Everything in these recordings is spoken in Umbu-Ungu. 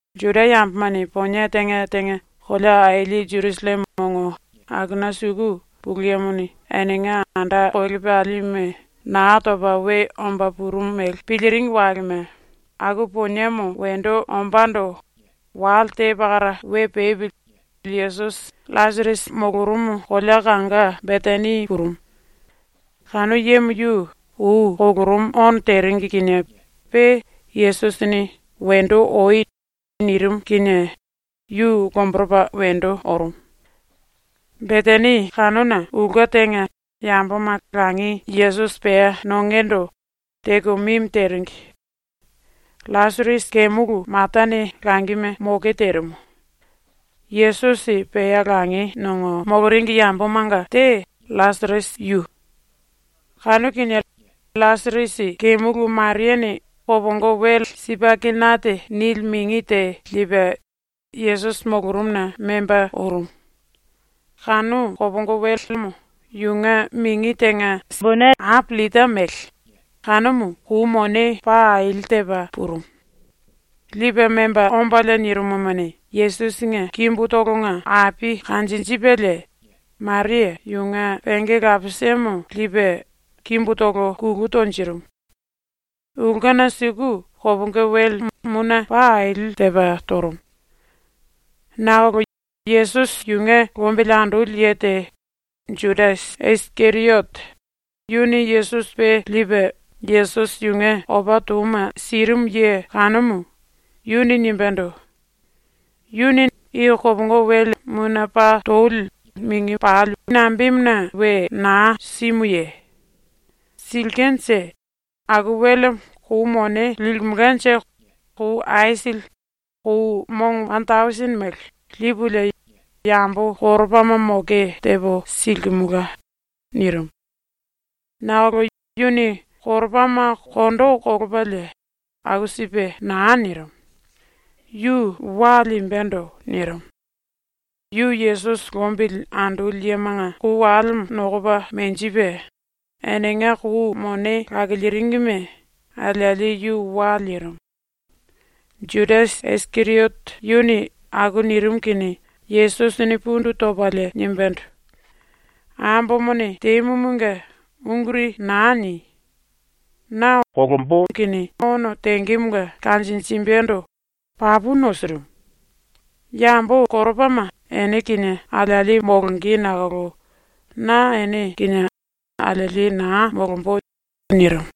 ⸤Juda yambomane ponie tenga tenga kolea aili Jerusalleme ongo akuna suku⸥ Pulu Yemone enenga anda kolepalime Naa Topa We Omba Purumu mele piliringi walema aku poniemo wendo ombando wale te pakara we pepili Yesusi LLasirasi molorumu kolea kanga Betani purumu. Kanu yemo yu ou kolorumu ono teringi kinie pe Yesusini “Wendo oi.” nirimu kinie yu lomboropa wendo orumu. Betani kanuna ulke tenga yamboma langi Yesusi pea nongendo teko mimi teringi. LLasirasi kemulu Matane langime moke terimu. Yesusi pea langi nongo moloringi yambomanga te LLasirasi yu. Kanu kinie LLasirasi kemulu Mariane kopongo wele ‘sipaikenate’ nili mingi te lipe Yesusi molorumuna memba orumu. Kanu kopongo welemo yunge mingi tenga sikele ape llita mele, kanumu kou mone paa aili tepa purumu. Lipe memba ombalie nirimumuni, Yesusinge kimbutolonga ape kanjinjipelie Maria yunge penge lapisemo lipe kimbutolo kulu tonjirimu. Ulkena suku kopongo wele mune paa aili tepa torumu. Nakolo Yesusi yunge lombili andoli ye te, Judasi Isikeriote, yuni Yesusi pe lipe Yesusi yunge opa touma sirimu ye kanumu, yuni nimbendo: “⸤Yuni nambemuna i kopongo wele mune paa toli mingi pali we naa simuye? Silkenje⸥ aku welemo kou mone limelkanje kou aisili, kou mongo wane tausini mele, lipulie yambo koropama moke tepo silimelka.” nirimu. Nakolo yuni koropama kondo kolopalie aku sipe naa nirimu. Yu wa limbendo nirimu. Yu Yesusi lombili andoli yemanga kou walemo nokopa menjipe, enenga kou mone lakiliringime alieli yu wa lirimu. ⸤Judasi Isikeriote yuni aku nirimu kinie⸥ Yesusini pundu topalie nimbendo: “Ambomone temumunge unguri naa ni! Na ono tengemonga kanjinjimbendo papu nosirimu. Yambo koropama ene kinie alieli molonge nakolo na ene kinie alieli naa molombo.” nirimu.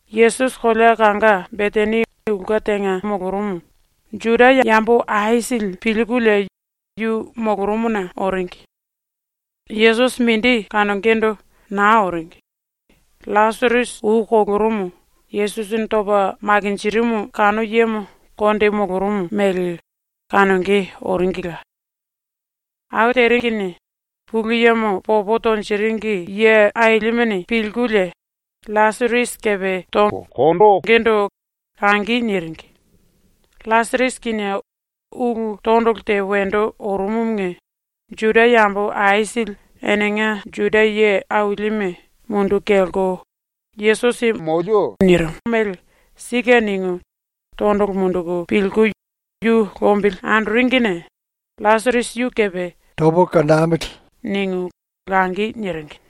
Yesusi kolea kanga Betani ulke tenga molorumu Juda yambo aisili pilkulie yu molorumuna oringi. Yesusi mindi kanongendo naa oringi. LLasirasi ou kolorumu Yesusini topa makinjirimu kanu yemo konde molorumu mele kanonge oringila. Aku teringine Pulu Yemo popo tonjiringi ye ailimene pilkulie LLasirasi kepe tongendo langi niringi. LLasirasi kinie ulu tondolo te wendo orumumunge Juda yambo aisili enenga Juda ye ailime munduku kelko Yesusi molemo nilimo mele ‘Sike.’ ningu tondolo munduku pilku yu lombili andoringine LLasirasi yu kepe “Tamili.” ningu langi niringi.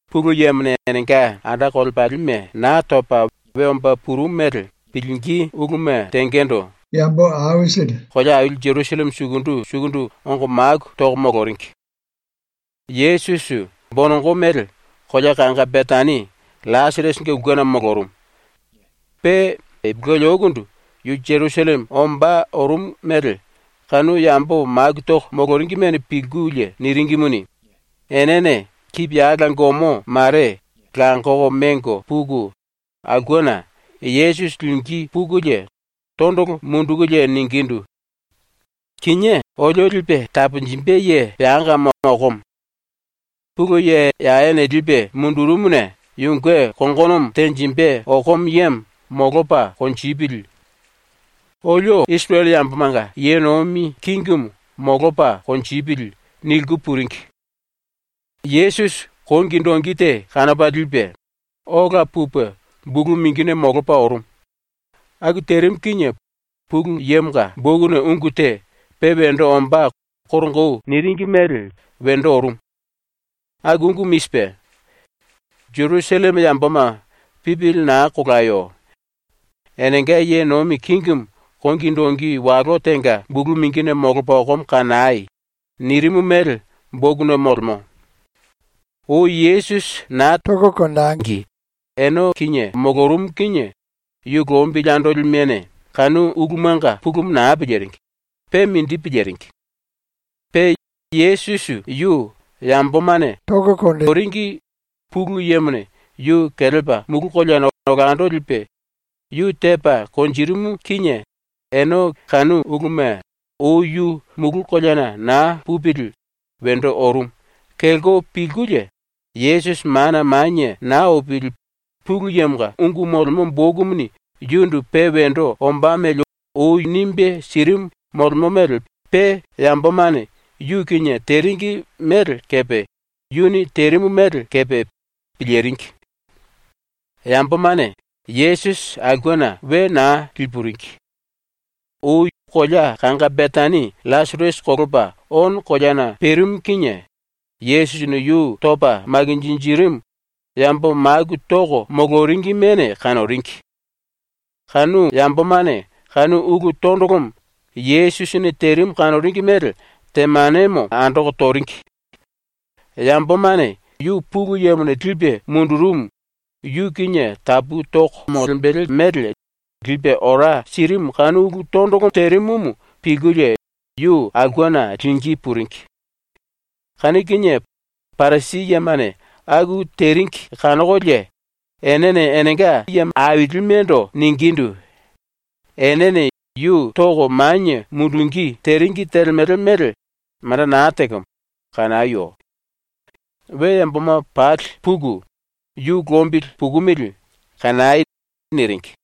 ⸤Pulu Yemone enenga anda kolepalime Naa Topa We Omba Purumu mele⸥ pilingí uluma tengendo kolea aili Jerusalleme sukundu sukundu ongo maku toko moloringi. Yesusi ⸤bonongo mele kolea kanga Betani LLasirasinge ulkena molorumu.⸥ Pe ipulueli oukundu yu Jerusalleme ombá orumu mele kanu yambo maku toko moloringimene pilkulie niringimuni, enene kipiyala gomo mare langoko mengo puku, aulkena Yesusi lingí pukulie tondolo mundukulie ningindu: “Kinié olio lipe taponjimbe ye peangamo okomo. Pulu Ye Yawene lipe mundurumuna yunge kongonomo tenjimbe okomo yemo molopa konjipili. ⸤Olio⸥ Isirele yambomanga ye nomi kingimu molopa konjipili.” niliku puringi. Yesusi kongi dongi te kanopa lipe, ola pupe bulu mingine molopa ⸤orumu⸥. Aku terimu kinie Pulu Yemonga bokuna ungu te, pe wendo ombá koronga ou niringi mele, wendo orumu. Aku ungumu i sipe: ‘Jerusalleme yamboma, pipili naa kolayo. Enenga ye nomi kingimu kongi dongi walo tenga bulu mingine molopa okomo kanai.’ nirimu mele bokuna molemo. Ou Yesusi naa tangi ene kinie molorumu kinie yu lombili andolimene kanu ulumanga pulumu naa piliringi, pe mindi piliringi. Pe Yesusi yu yambomane toringi Pulu Yemone yu kelepa mulu koleana olando lipe yu tepa konjirimu kinie ene kanu uluma, ou yu mulu koleana naa pupili wendo orumu, kelko pilkulie, Yesusi mana manie naa opili Pulu Yemonga bokumuni yundu pe wendo ombá mele ou nimbe sirimu molemo mele pe yambomane yu kinie teringi mele kepe yuni terimu mele kepe piliringi. Yambomane Yesusi aulkena we naa lipuringi. Ou kolea kanga Betani LLasirasi kolopa ono koleana perimu kinie Yesusini yu topa makinjirimu yambo maku toko moloringimene kanoringi. Kanu yambomane kanu ulu tondolomo Yesusini terimu kanoringi mele temanemo andoko toringi. Yambomane yu Pulu Yemone lipe mundurumu, yu kinie tapu toko molembele mele lipe ora sirimu kanu ulu tondolo terimumu pilkulie yu aulkena lingí puringi. Kanu kinie Parisi yemane aku teringi kanokolie enene enenga ailimendo ningindu: “Enene yu toko manie mundungí teringi telemele mele manda naa tekemo kanayo. We yamboma pali puku yu lombili pukumili kanai.” niringi.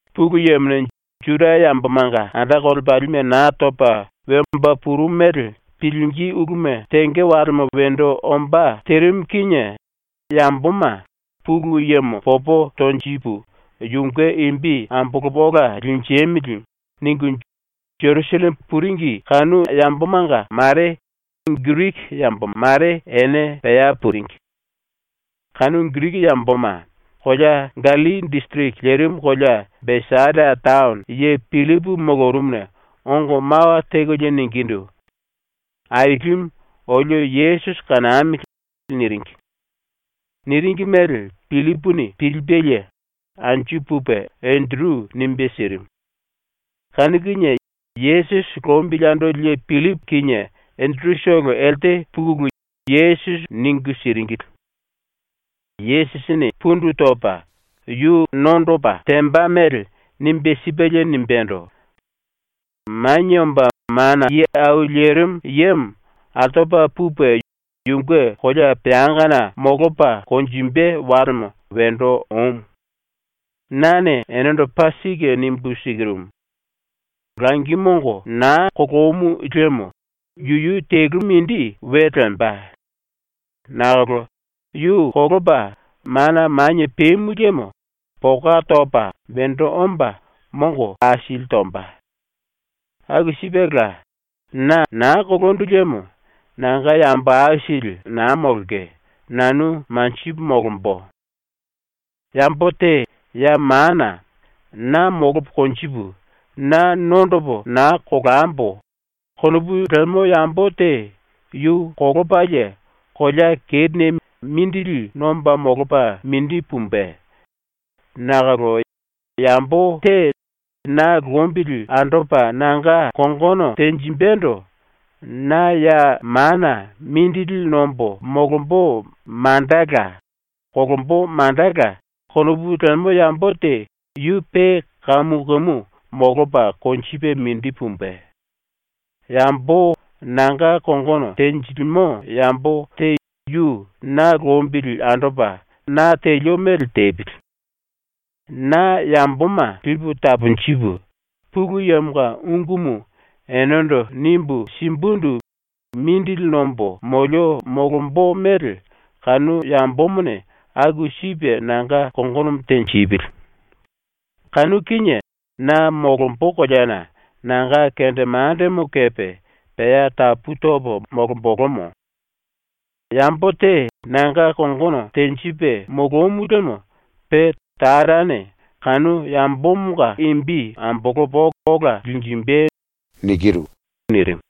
⸤Pulu Yemone Juda yambomanga anda kolepalime Naa Topa We Omba Purumu mele⸥ pilingí uluma tenge walema wendo ombá terimu kinie yamboma ‘Pulu Yemo popo tonjipu yunge imbi ambolopo ola linjemili.’ ningu Jerusalleme puringi kanu yambomanga mare Giriki yambo mare ene pea puringi. Kanu Giriki yamboma kolea Gallilli disiriki lerimu kolea Besaida taono ye Pillipu molorumuna ongo mawa tekolie ningindu: “Ailimu, olio Yesusi kanamili.” niringi. Niringi mele Pillipuni pilipelie anju pupe Enderu nimbe sirimu. Kanu kinie Yesusi lombili andoli ye Pillipu kinie Enderutolo elte pukulu Yesusi ningu siringili. Yesusini pundu topa yu nondopa temba mele nimbe sipelie nimbendo: “Manie Omba Mana Ye Au Lerimu Yemo altopa pupe yunge kolea peangana molopa konjimbe walemo wendo omu. Nane enendo paa sike nimbu sikirumu: Langi mongo naa kolomu liemo yuyu telu mindi we lemba. Nakolo yu kolopa mana manie pemu liemo poka topa wendo omba mongo aisili tomba. ⸤Aku sipela na naa kolondu liemo nanga yambo aisili naa molonge, nanu manjipu molombo.⸥ “Yambo te ya mana ‘Na molopo konjipu, na nondopo naa kolambo.’ konopu lemo yambo te yu kolopalie kolea kerine mindili nomba molopa mindi pumbe. Nakolo yambo te na lombili andopa nanga kongono tenjimbendo ‘Na ya mana mindili nombo molombo mandala, kolombo mandala.’ konopu lemo yambo te yu pe kamu kamu molopa konjipe mindi pumbe. Yambo nanga kongono tenjilimo yambo te yu na lombili andopa na telio mele tepili. Na yamboma lipu taponjipu, Pulu Yemonga ungumu enendo nimbu simbundu mindili nombo molio molombo mele kanu yambomone aku sipe nanga kongono tenjipili. Kanu kinie na molombo koleana nanga kendemandemo kepe pea tapu topo molombolomo. Yambo te nanga kongono tenjipe molomu liemo pe Tarane kanu yambomonga imbi ambolopa ola linjimbe.” ⸤nirimu.⸥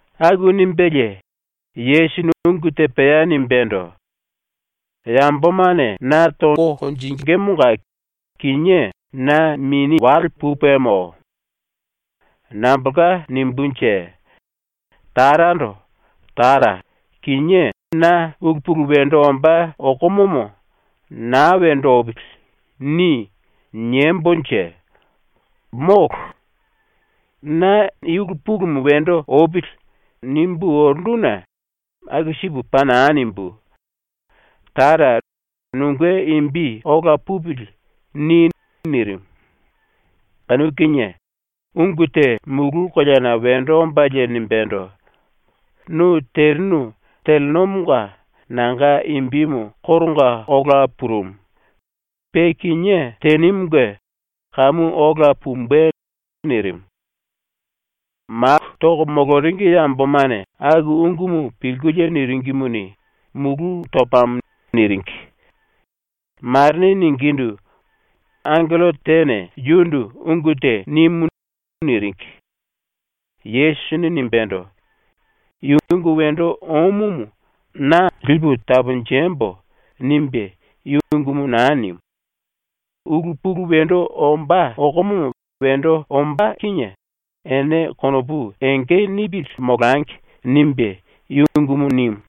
⸤Aku nimbelie Yesusini ungu te pea nimbendo:⸥ “Yambomane na tongemonga kinié na mini wale pupemo. Nambolka nimbunje? Tarando “Tara, kinié na ulu pulu wendo ombá okomomo ‘Naa wendo opili.’ ni.” niembonje? Molo. Na ‘I ulu pulumu wendo opili.’ nimbu orunduna aku sipu paa naa nimbú. Tara, nunge imbi ‘Ola pupili.’ ni.” nirimu. Kanu kinie ungu te mulu koleana wendo ombalie nimbendo: “Nu terinu telenomonga nanga imbimu koronga ola purumu. Pe kinié tenimunge kamu ola pumbe.” nirimu. Maku toko moloringi yambomane aku ungumu pilkulie niringimuni, “Mulu topamo.” niringi. Marene ningindu: “Mulu koleana angello tene yundu ungu te nimu.” niringi. Yesusini nimbendo: “I ungu wendo omumu na ‘Lipu taponjembo.’ nimbe i ungumu naa nimu. ‘Ulu pulu wendo ombá okomomo wendo ombá kinie ene konopu enge nipili molangi.’ nimbe i ungumu nimu.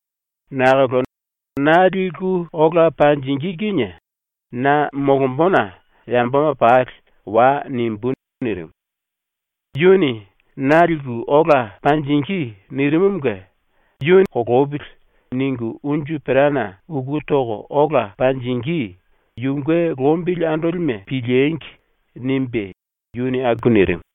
Nakolo na liku ola monjingí kinie na molombona yamboma pali “Wai.” nimbú.” nirimu. (Yuni “Na liku ola panjingí.” nirimumunge ‘Na ‘Kolopili.’ ningu unju perana uku toko ola panjingí yunge lombili andolime piliengi!’ nimbe yuni aku nirimu.)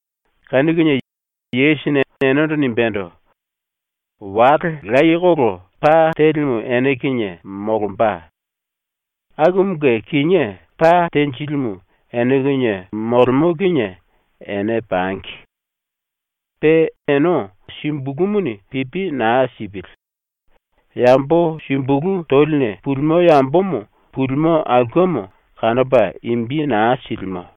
Kanu kinie Yesusini enendo nimbendo: “Wale layekolo pa telimu ene kinie molomba. Akumunge kinié pa tenjilimu ene kinie molemo kinie ene pangi. Pe ene sumbulumuni pipi naa sipili. Yambo sumbulu toline pulimo yambomo pulimo aulkemo kanopa imbi naa silimo.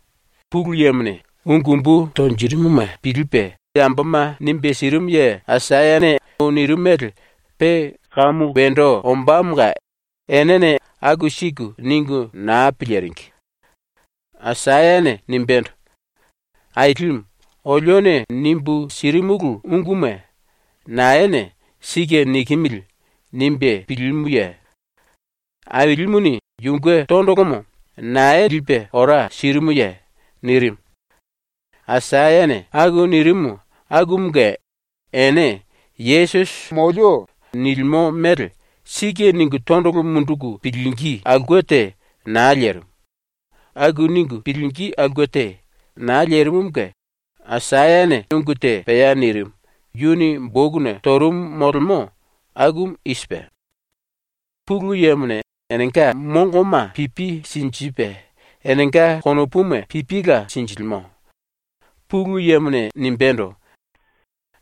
Pulu Yemone ungu umbu tonjirimuma pilipe yamboma nimbe sirimu ye Aisayane ou nirimu mele pe kamu wendo ombámonga enene aku siku ningu naa piliringi. Aisayane nimbendo: “Ailimu, olione nimbu sirimulu unguma naene ‘Sike nikimili.’ nimbe pilimuye? Ailimuni yunge tondolomo nae lipe ora sirimuye?” nirimu. Aisayane aku nirimu akumunge ene Yesusi molemo nilimo mele ‘Sike.’ ningu tondolo munduku pilingí aulke te naa lerimu. Aku ningu pilingí aulke te naa lerimumunge Aisayane ungu te pea nirimu, yuni bokuna torumu molemo, akumu i sipe: “Pulu Yemone enenga mongoma pipi sinjipe, enenga konopuma pipila sinjilimo. Pulu Yemone nimbendo: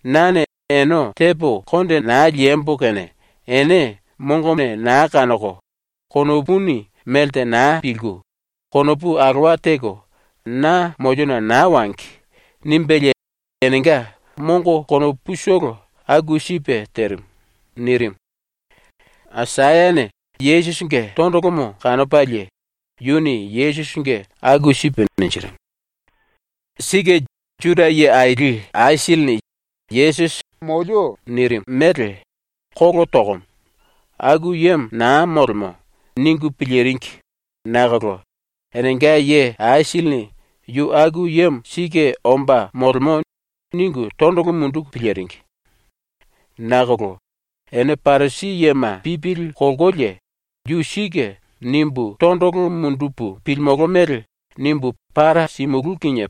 “Nane ene tepo konde naa liembo kene ene mongone naa kanoko, konopuni melte naa pilku, konopu alowa teko na moliona naa wangi.” nimbelie enenga mongo konoputolo aku sipe terimu.” Nirimu. Aisayane Yesusinge tondolomo kanopalie yuni Yesusinge aku sipe ninjirimu. Sike Juda ye aili aisilini Yesusi molemo nilimo mele ‘Kolo tokomo. Aku yemo naa molemo.’ ningu piliringi nakolo enenga ye aisilini ‘Yu aku yemo sike omba molemo.’ ningu tondolo munduku piliringi. Nakolo ene Parisi yema pipili kolkolie, ‘ ‘Yu sike.’ nimbu tondolo mundupu pilimolo mele nimbu para simulú kinie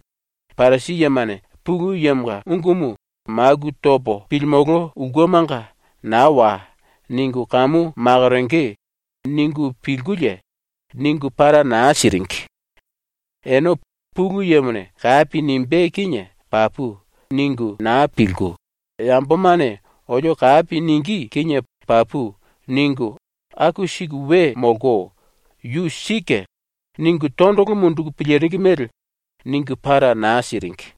Parisi yemane Pulu Yemonga ungumu maku topo pilimolo ulkemanga ‘naa wai.’ ningu kamu makoronge.’ ningu pilkulie, ningu para naa siringi. Ene ‘Pulu Yemone kapi nimbé kinie papu.’ ningu naa pilku, ‘Yambomane olio kapi ningí kinie papu.’ ningu aku siku we molko, yu ‘Sike.’ ningu tondolo munduku piliringi mele ningu para naa siringi.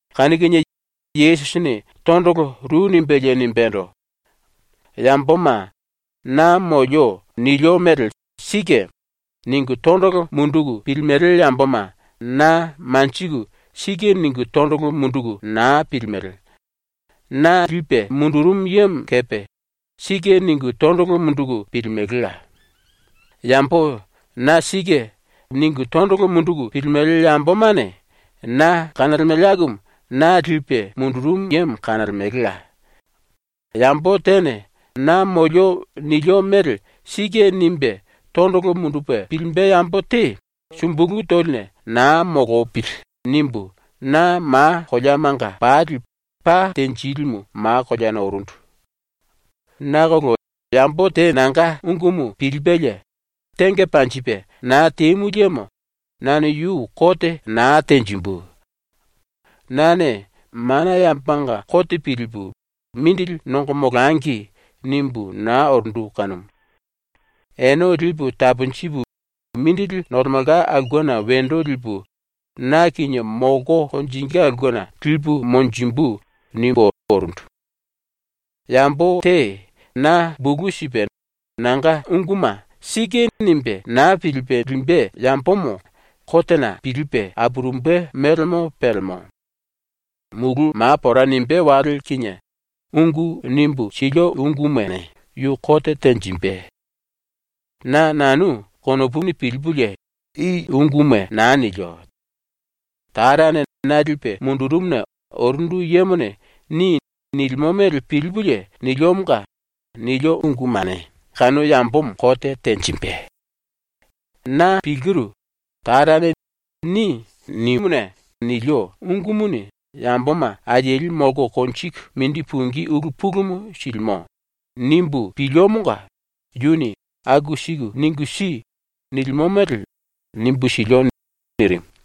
Kanu kinie Yesusini tondolo ru nimbelie nimbendo: “Yamboma ‘Na molio nilio mele sike.’ ningu tondolo munduku pilimele yamboma na manjiku ‘Sike’ ningu tondolo munduku naa pilimele. Na lipe mundurumu yemo kepe ‘Sike’ ningu tondolo munduku pilimelela. Yambo ‘Na sike.’ ningu tondolo munduku pilimele yambomane na kanolemele akumu na lipe mundurumu yemo kanolemelela. Yambo tene ‘Na molio nilio mele sike.’ nimbe tondolo mundupe pilimbe yambo te sumbulu toline naa molopili.’ nimbu na ma koleamanga pali pa tenjilimu ma koleana orundu. “Nakolo yambo te nanga ungumu pilipelie tenge panjipe naa temu liemo nane yu kote naa tenjimbu. Nane mana yambomanga kote pilipu ‘mindili nongo molangi.’ nimbu naa orundu kanumu. ‘Ene lipu taponjipu mindili nolemelka aulkena wendo lipu, na kinie molko konjingí aulkena lipu monjimbu.’ nimbú orundu. Yambo te na bulu sipe nanga unguma ‘Sike.’ nimbe naa pilipe limbe yambomo kotena pilipe apurumbe mélemo pelemo. Mulu ma pora nimbé wale kinie ungu nimbu silio ungumane yu kote tenjimbe. Na nanu konopuni pilipulie i unguma naa nilio. Tarane na lipe mundurumuna orundu yemone “Ni.” nilimo mele pilipulie niliomonga, nilio ungumane kanu yambomo kote tenjimbe. Na pilkiru, ‘Tarane “Ni.” nimuna nilio ungumuni yamboma alieli molko konjiku mindi pungí ulu pulumu silimo.’ nimbu piliomonga yuni “Aku siku ningu si.” nilimo mele nimbu silio.” nirimu.